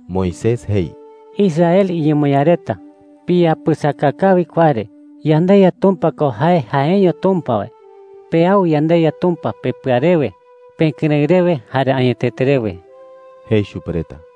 Moisés jei: “Israel iñemoñaa reta, piyapɨsaka kawi kua re. YandeYa Tumpa ko jae jaeño Tumpa wae. Peau yandeYa Tumpa pepɨa rewe, pekɨrëɨ rewe, jare añetete rewe,” jei chupe reta.